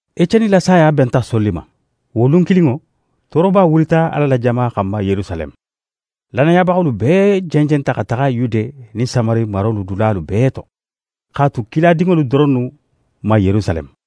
Eceni la saya benta Soli ma. Wo lun kilinŋo, tooroba wulita Ala la jama xanma Yerusaleme. Lannayabaxolu bee jenjenta xa taxa Yude nin Samari marolu dulalu bee to, x'a tu kiladinŋolu doronnu ma Yerusaleme.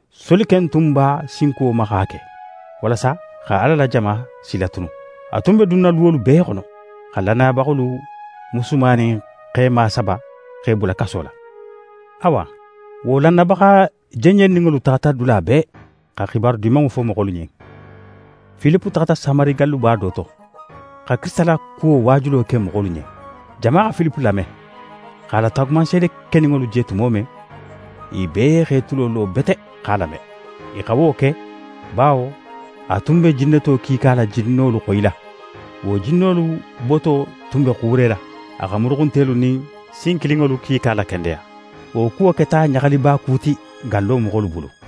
Soli ken tun b'a sinkuwo ma x'a ke, walasa xa Ala la jama silatunu. A tun be dunna luwolu bee xono, xa lannayabaxolu musuma nin xema saba, x'e bula kaso la. Awa, wo lannayabaxa jenjenninŋolu taxata dula bee, xa xibaru Dimanŋo fo moxolu ɲen. Filipe taxata Samari galluba do to, xa Kirisita la kuwo waajulo ke je moxolu ɲen. Jama xa Filipe lame, x'a la taagumanseede keninŋolu je tumo men, i bee x'e tulo lo bete x'a lame. I xa wo ke, bawo a tun be jinneto kiika la jinnolu xoyila. Wo jinnolu boto tun be xuurela. A xa muruxuntelu nin sin kilinŋolu kiika lakendeya. Wo kuwo keta ɲaxalikuba ti wo gallo moxolu bulu.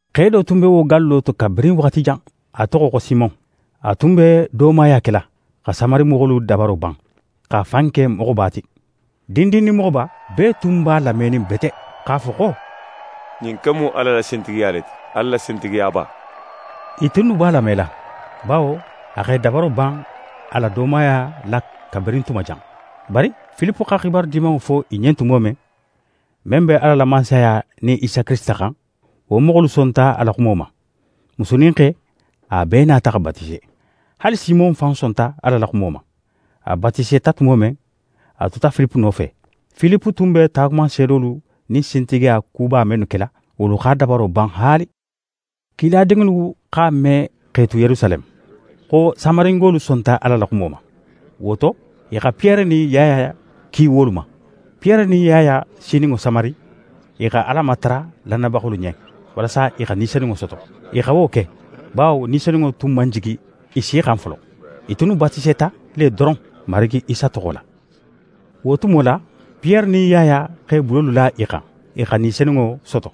Xe do tun be wo gallo to kabirin waxati jan, a toxo xo Simon. A tun be doomaya kela, xa Samari moxolu dabaro ban, x'a fan ke moxoba ti. Dindin nin moxoba, bee tun b'a lamenin bete x'a fo xo: «Ɲin ken mu Ala la sintigiya le ti, Ala la sintigiyaba.» I tunnu b'a lamela, bawo a x'e dabaro ban a la doomaya la kabirin tuma jan. Bari Filipe xa Xibaru Dimanŋo fo i ɲen tumo men, men be Ala la Mansaya nin Isa Kirisita xan, wo moxolu sonta a la xumo ma. Musu nin xe, a bee nata xa batise. Haali Simon fan sonta Ala la xumo ma. A batiseta tumo men, a tuta Filipe nofe. Filipe tun be taagumanseedolu nin sintigiya kuba mennu kela, wolu x'a dabaro ban haali. Kiladinŋolu x'a me x'e tu Yerusaleme, xo Samaringolu sonta Ala la xumo ma. Wo to, i xa Piyere nin Yaya ki wolu ma. Piyere nin Yaya sininŋo Samari, i xa Ala matara lannayabaxolu ɲen, walasa i xa Ni Senunŋo soto. I xa wo ke, bawo Ni Senunŋo tun man jigi i si xan folo. I tunnu batiseta le doron Marigi Isa toxo la. Wo tumo la, Piyere nin Yaya x'e bulolu la i xan, i xa Ni Senunŋo soto.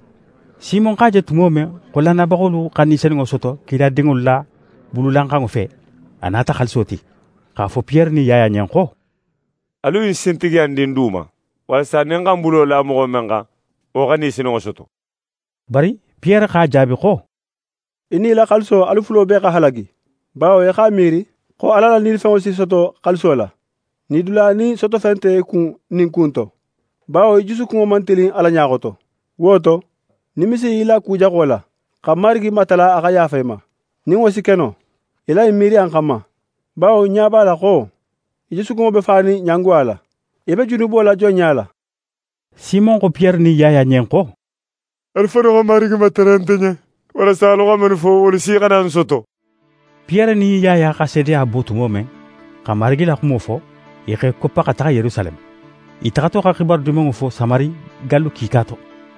Simon x'a je tumo men xo lannayabaxolu xa Ni Senunŋo soto kiladinŋolu la bululanxanŋo fe, a nata xaaliso ti, x'a fo Piyere nin Yaya ɲen xo: «Alu ɲin sintigiya in di ń du ma, walasa nin ń xa ń bulo la moxo men xan, wo xa Ni Senunŋo soto.» Bari Piyere x'a jaabi xo: «Í nin í la xaaliso alu fulo bee xa halagi, bawo í x'a miiri xo Ala la nilifenŋo si soto xaaliso la. Nidula nin sotofen nte í kun ɲin ku in to, bawo í jusukunŋo man tilin Ala ɲa xoto. Wo to, nimisi í la ku jaxo la, xa Marigi matara a xa yaafa í ma, nin wo si ke no, í la ɲin miiriya in xanma. Bawo ń ɲa b'a la xo í jusukunŋo be fanin ɲangoya la. Í be junubo la jonɲa la.» Simon xo Piyere nin Yaya ɲen xo: «Alu fannu xa Marigi matara nte ɲen walasa alu xa mennu fo, wolu si xana ń soto.» Piyere nin Yaya xa seedeya bo tumo men, xa Marigi la xumo fo, i x'e koppa xa taxa Yerusaleme. I taxato xa Xibaru Dimanŋo fo Samari gallu kiika to.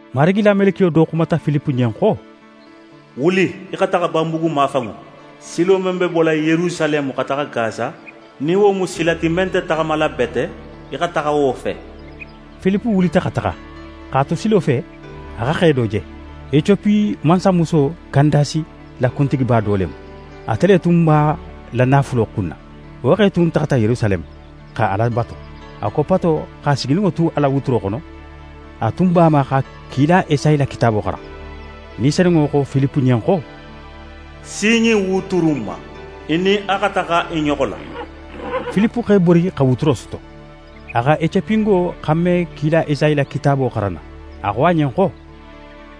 Marigi la melekiyo do xumata Filipe ɲen xo: «Wuli í xa taxa banbugu mafanŋo. Silo men be bola Yerusaleme xa taxa Gasa, nin wo mu sila ti men nte taxamala bete, í xa taxa wo fe.» Filipe wulita xa taxa. X'a tu silo fe, a xa xe do je. Ecopi mansamuso Kandasi la kuntigiba do le mu. Ate le tun b'a la naafulo kunna. Wo xe tun taxata Yerusaleme, xa Ala batu. A koppato, x'a sigininŋo tu a la wuturo xono, a tun b'a ma xa kila Esayi la kitaabo xaran. Ni Senunŋo xo Filipe ɲen xo: «Si ɲin wuturu in ma, í nin a xa taxa i ɲoxo la.» Filipe x'é bori xa wuturo soto. A xa Ecopingo xanme kila Esayi la kitaabo xaranna. A xo a ɲen xo: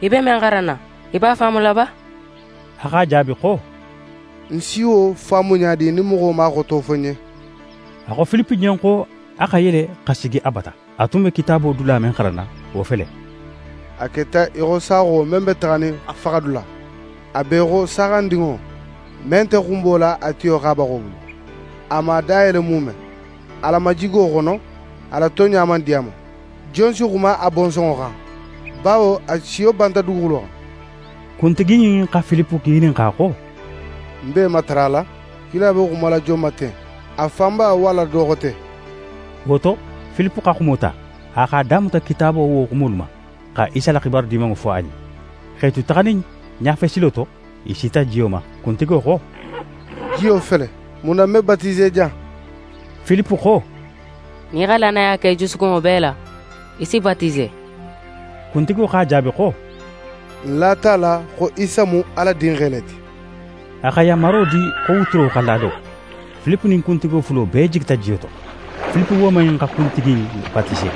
«Í be men xaranna, í b'a faamula ba?» A x'a jaabi xo: «Ń si wo faamu ɲa di nin moxo man a xoto fo ń ɲen?» A xo Filipe ɲen xo a xa yele xa sigi a bata. A tun be Kitaabo dula men xaranna, wo fele: «A keta í xo saaxo men be taxanin a faxadula; a be í xo saaxandinŋo, men nte xunbola a tiyo xabaxo bulu; a man a da yele muume. A la majigo xono, a la tonɲa man di a ma. Jon si xuma a bonsonŋo xan; bawo a siyo banta duguxulo xan?» Kuntigi in xa Filipe ŋininxa xo: «Ń b'é matarala, kila be xumala jon ma ten? A fan ba, walla do xote?» Wo to, Filipe xa xumo ta, a x'a damuta Kitaabo wo xumolu ma, xa Isa la xibaru Dimanŋo fo a ɲen. X'e tu taxanin ɲafe silo to, i sita jiyo ma. Kuntigo xo: «Jiyo fele, mun na ń me batise jan?» [ Filipe xo: «Nin í xa lannaya ke í jusukunŋo bee la, í si batise.» Kuntigo x'a jaabi xo: «Ń lata a la xo Isa mu Ala Dinxe le ti.»] A xa yanmaro di xo wuturo xa lalo. Filipe nin kuntigo fulo bee jigita jiyo to. Filipe woman in xa kuntigi in batise.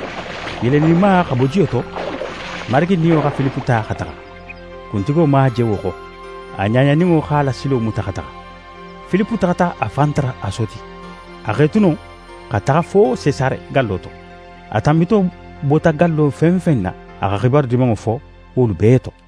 I yeleninma xa bo jiyo to, Marigi Niyo xa Filipe ta xa taxa. Kuntigo man a je wo xo. A ɲaɲaninŋo x'a la silo muta xa taxa. Filipe taxata a fan tara Asoti. A x'é tu non, xa taxa fo Sesare gallo to. A tanbito bota gallo fen fen na, a xa Xibaru Dimanŋo fo wolu bee to.